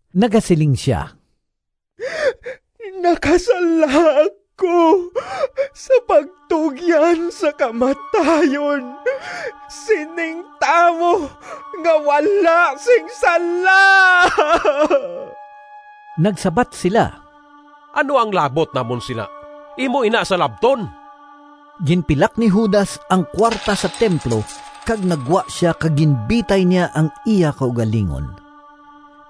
Nagasiling sia, “Nakasala ako sa pagtugyan sa kamatayon sining tawo nga wala sing sala!” Nagsabat sila, “Ano ang labot namon sina? Imo ina salabton!” Ginpilak ni Judas ang kuwarta sa templo kag naggwa sia kag ginbitay niya ang iya kaugalingon.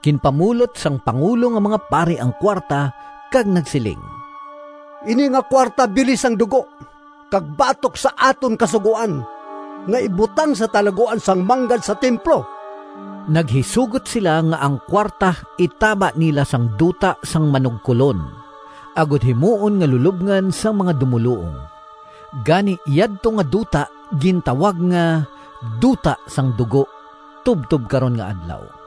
Ginpamulot sang pangulo nga mga pari ang kuwarta kag nagsiling, “Ini nga kuwarta bili sang dugo, kag batok sa aton Kasugoan nga ibutang sa talaguan sang manggad sa templo.” Naghisugot sila nga ang kuwarta itaba nila sang Duta sang Manugkolon, agod himuon nga lulobngan sang mga dumoluong. Gani yadto nga duta gintawag nga “Duta sang dugo” tubtob karon nga adlaw.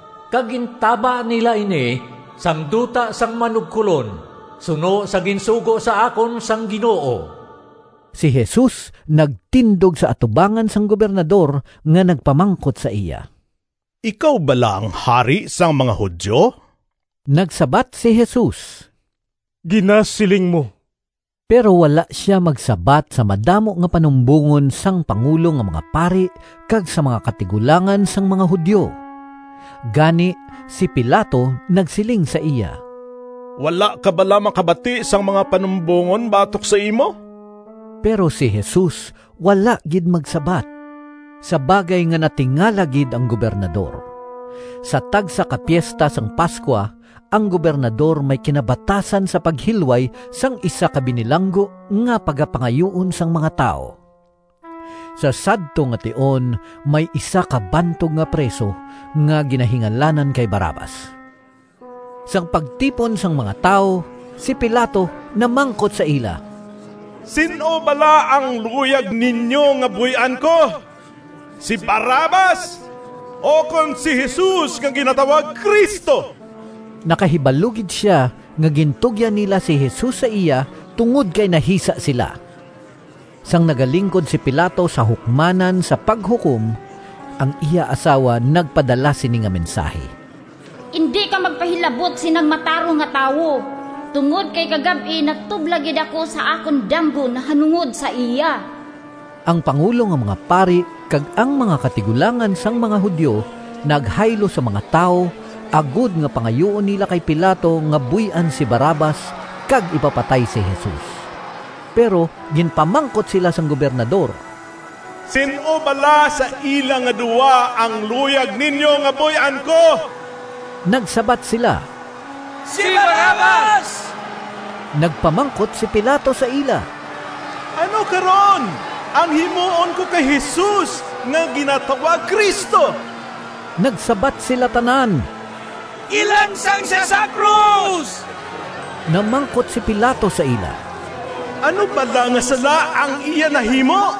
kag gintaba nila ini sang duta sang manugkolon suno sa ginsugo sa akon sang Ginoo.” Si Jesus nagtindog sa atubangan sang Gobernador nga nagpamangkot sa iya, “Ikaw bala ang hari sang mga Judio?” Nagsabat si Jesus, “Ginasiling mo.” Pero wala sia magsabat sa madamo nga panumbongon sang pangulo nga mga pari kag sa mga katigulangan sang mga Judio. Gani si Pilato nagsiling sa iya, “Wala ka bala makabati sang mga panumbongon batok sa imo?” Pero si Jesus wala gid magsabat, sa bagay nga natingala gid ang Gobernador. Sa tagsa ka Piesta sang Pascua ang Gobernador may kinabatasan sa paghilway sang isa ka binilanggo nga pagapangayuon sang mga tawo. Sa sadto nga tion may isa ka bantog nga priso nga ginahingalanan kay Barrabas. Sang pagtipon sang mga tawo, si Pilato namangkot sa ila, “Sin-o bala ang luyag ninyo nga buy-an ko, si Barrabas ukon si Jesus nga ginatawag Cristo?” Nakahibalo gid sia nga gintugyan nila si Jesus sa iya tungod kay nahisa sila. Sang nagalingkod si Pilato sa hukmanan sa paghukom, ang iya asawa nagpadala sini nga mensahi, “Indi ka magpahilabot sinang matarong nga tawo, tungod kay kagab-i natublag gid ako sa akon damgo nahanungod sa iya.” Ang pangulo nga mga pari kag ang mga katigulangan sang mga Judio naghaylo sa mga tawo, agod nga pangayuon nila kay Pilato nga buy-an si Barrabas, kag ipapatay si Jesus. Pero ginpamangkot sila sang Gobernador, “Sin-o bala sa ila nga duha ang luyag ninyo nga buy-an ko?” Nagsabat sila, “Si Barrabas!” Nagpamangkot si Pilato sa ila, “Ano karon ang himuon ko kay Jesus nga ginatawag Cristo?” Nagsabat sila tanan, “Ilansang sia sa krus!” Namangkot si Pilato sa ila, “Ano bala nga sala ang iya nahimo?”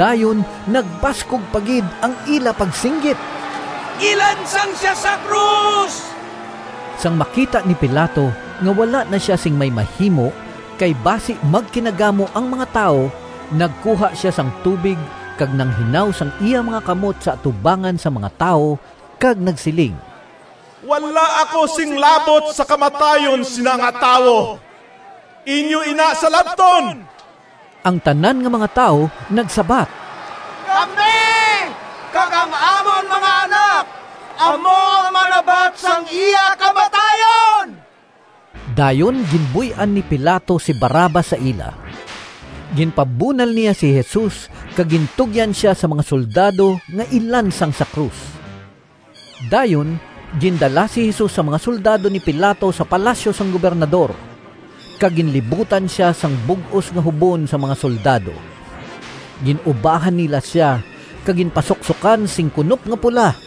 Dayon nagbaskog pa gid ang ila pagsinggit, “Ilansang sia sa krus!” Sang makita ni Pilato nga wala na sia sing may mahimo kay basi magkinagamo ang mga tawo, nagkuha sia sang tubig kag nanghinaw sang iya mga kamot sa atubangan sang mga tawo, kag nagsiling, “Wala ako sing labot sa kamatayon sina nga tawo! Inyo ina salabton!” Ang tanan nga mga tawo nagsabat, “Kami kag ang amon mga anak amo ang manabat sang iya kamatayon!” Dayon ginbuy-an ni Pilato si Barrabas sa ila. Ginpabunal niya si Jesus kag gintugyan sia sa mga soldado nga ilansang sa krus. Dayon gindala si Jesus sang mga soldado ni Pilato sa palasyo sang Gobernador, kag ginlibutan sia sang bug-os nga hubon sang mga soldado. Gin-ubahan nila sia, kag ginpasuksokan sing kunop nga pula.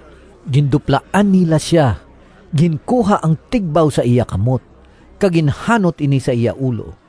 Ginduplaan nila sia, ginkuha ang tigbaw sa iya kamot kag ginhanot ini sa iya ulo.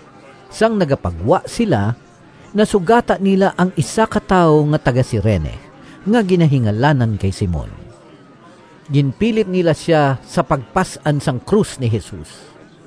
Sang nagapagwa sila nasugata nila ang isa ka tawo nga taga-Cirene, nga ginahingalanan kay Simon. Ginpilit nila sia sa pagpas-an sang krus ni Jesus.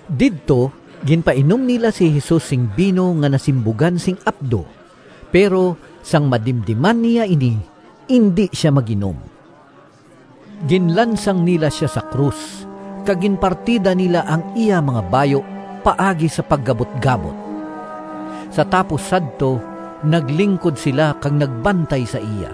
Didto ginpainom nila si Jesus sing bino nga nasimbugan sing apdo, pero sang madimdiman niya ini, indi sia mag-inom. Ginlansang nila sia sa krus, kag ginpartida nila ang iya mga bayu paagi sa pagabutgabot. Sa tapos sadto naglingkod sila kag nagbantay sa iya.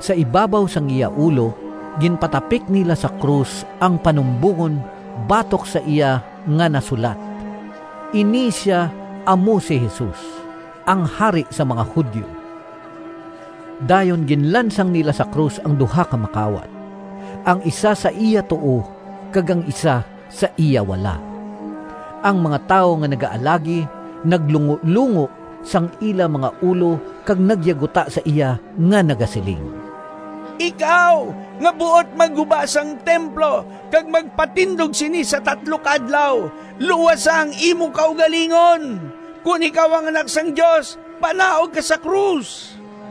Sa ibabaw sang iya ulo ginpatapik nila sa krus ang panumbongon batok sa iya nga nasulat, “Ini sia amo si Jesus, ang Hari sang mga Judio.” Dayon ginlansang nila sa krus ang duha ka makawat, ang isa sa iya tuo kag ang isa sa iya wala. Ang mga tawo nga nagaalagi naglungolungo sang ila mga ulo kag nagyaguta sa iya nga nagasiling, “Ikaw nga buot magguba sang templo kag magpatindog sini sa tatlo ka adlaw, luwasa ang imo kaugalingon! Kon ikaw ang Anak sang Dios, panaog ka sa krus!”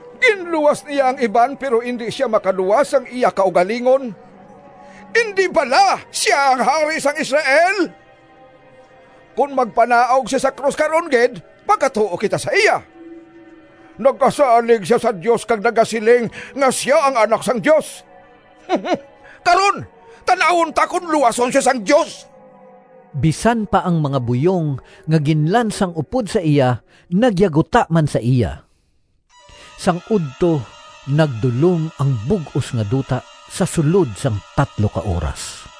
“Ginluwas niya ang iban pero indi sia makaluwas sang iya kaugalingon! Indi bala sia ang Hari sang Israel? Kon magpanaog sia sa krus karon gid, magatuo kita sa iya! Nagasalig sia sa Dios kag nagasiling nga sia ang Anak sang Dios. Karon tan-awon ta kon luwason sia sang Dios!” Bisan pa ang mga buyong nga ginlansang upod sa iya nagyaguta man sa iya. Sang udto nagdulom ang bug-os nga duta sa sulod sang tatlo ka oras.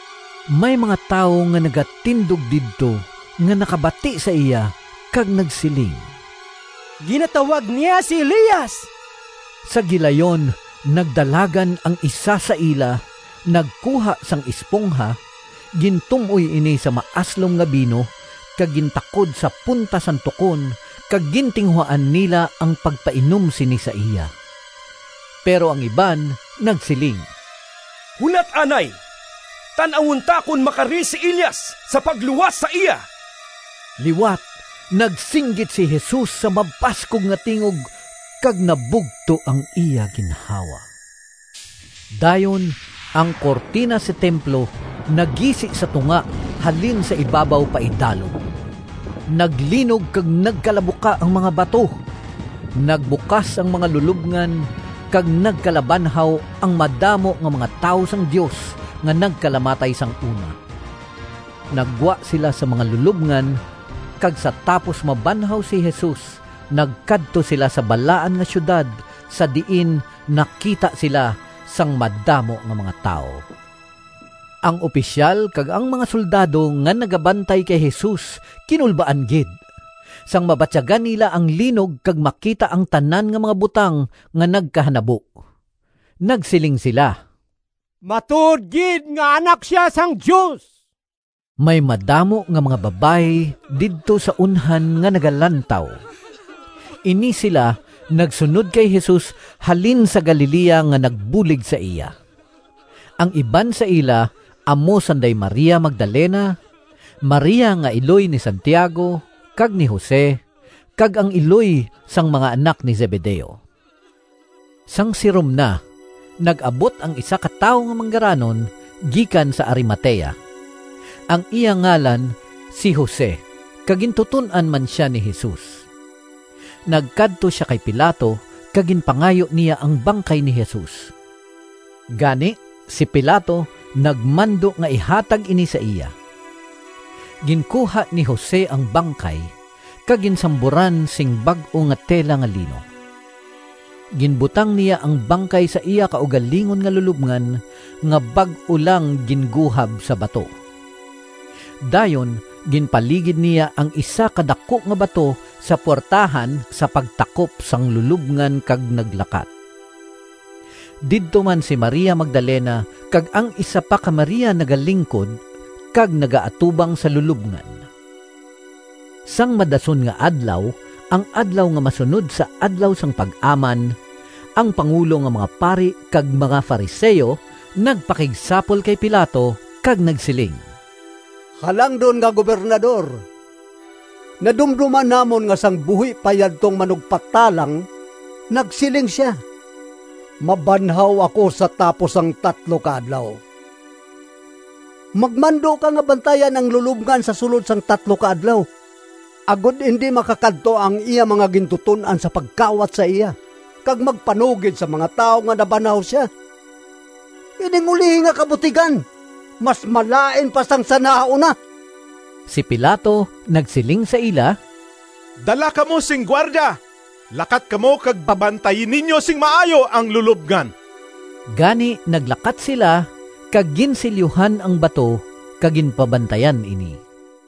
May mga tawo nga nagatindog didto nga nakabati sa iya kag nagsiling, “Ginatawag niya si Elias!” Sa gilayon nagdalagan ang isa sa ila, nagkuha sang espongha, gintum-oy ini sa maaslom nga bino, kag gintakod sa punta sang tukon kag gintinguhaan nila ang pagpainom sini sa iya. Pero ang iban nagsiling, “Hulat anay, tan-awon ta kon makari si Elias sa pagluwas sa iya!” Liwat nagsinggit si Jesus sa mabaskog nga tingog kag nabugto ang iya ginhawa. Dayon ang kurtina sa templo nagisi sa tunga, halin sa ibabaw paidalom. Naglinog kag nagkalabuka ang mga bato, nagbukas ang mga lulobngan, kag nagkalabanhaw ang madamo nga mga tawo sang Dios nga nagkalamatay sang una. Naggwa sila sa mga lulobngan, kag sa tapos mabanhaw si Jesus nagkadto sila sa Balaan nga Siyudad, sa diin nakita sila sang madamo nga mga tawo. Ang opisyal kag ang mga soldado nga nagabantay kay Jesus kinulbaan gid, sang mabatyagan nila ang linog kag makita ang tanan nga mga butang nga nagkahanabo. Nagsiling sila, “Matuod gid nga Anak sia sang Dios!” May madamo nga mga babayi didto sa unhan nga nagalantaw. Ini sila nagsunod kay Jesus halin sa Galilea nga nagbulig sa iya. Ang iban sa ila amo sanday Maria Magdalena, Maria nga iloy ni Santiago kag ni Jose, kag ang iloy sang mga anak ni Zebedeo. Sang sirom na, nag-abot ang isa ka tawo nga manggaranon gikan sa Arimatea. Ang iya ngalan si Jose kag gintuton-an man sia ni Jesus. Nagkadto sia kay Pilato kag ginpangayo niya ang bangkay ni Jesus. Gani si Pilato nagmando nga ihatag ini sa iya. Ginkuha ni Jose ang bangkay, kag ginsamburan sing bag-o nga tela nga lino. Ginbutang niya ang bangkay sa iya kaugalingon nga lulobngan, nga bag-o lang ginguhab sa bato. Dayon ginpaligid niya ang isa ka daku nga bato sa puwertahan sa pagtakop sang lulobngan kag naglakat. Didto man si Maria Magdalena, kag ang isa pa ka Maria nagalingkod kag nagaatubang sa lulobngan. Sang madason nga adlaw, ang adlaw nga masunod sa Adlaw sang Pag-aman, ang pangulo nga mga pari kag mga Fariseo nagpakigsapol kay Pilato kag nagsiling, “Halangdon nga Gobernador, nadumdoman namon nga sang buhi pa yadtong manugpatalang nagsiling sia, ‘Mabanhaw ako sa tapos ang tatlo ka adlaw.’ Magmando ka nga bantayan ang lulobngan sa sulod sang tatlo ka adlaw, agod indi makakadto ang iya mga gintuton-an sa pagkawat sa iya kag magpanugid sa mga tawo nga ‘Nabanhaw sia.’ Ining ulihi nga kabutigan mas malain pa sang sa nahauna.” Si Pilato nagsiling sa ila, “Dala kamo sing gwardya! Lakat kamo kag pabantayi ninyo sing maayo ang lulobngan.” Gani naglakat sila, kag ginsilyuhan ang bato kag ginpabantayan ini.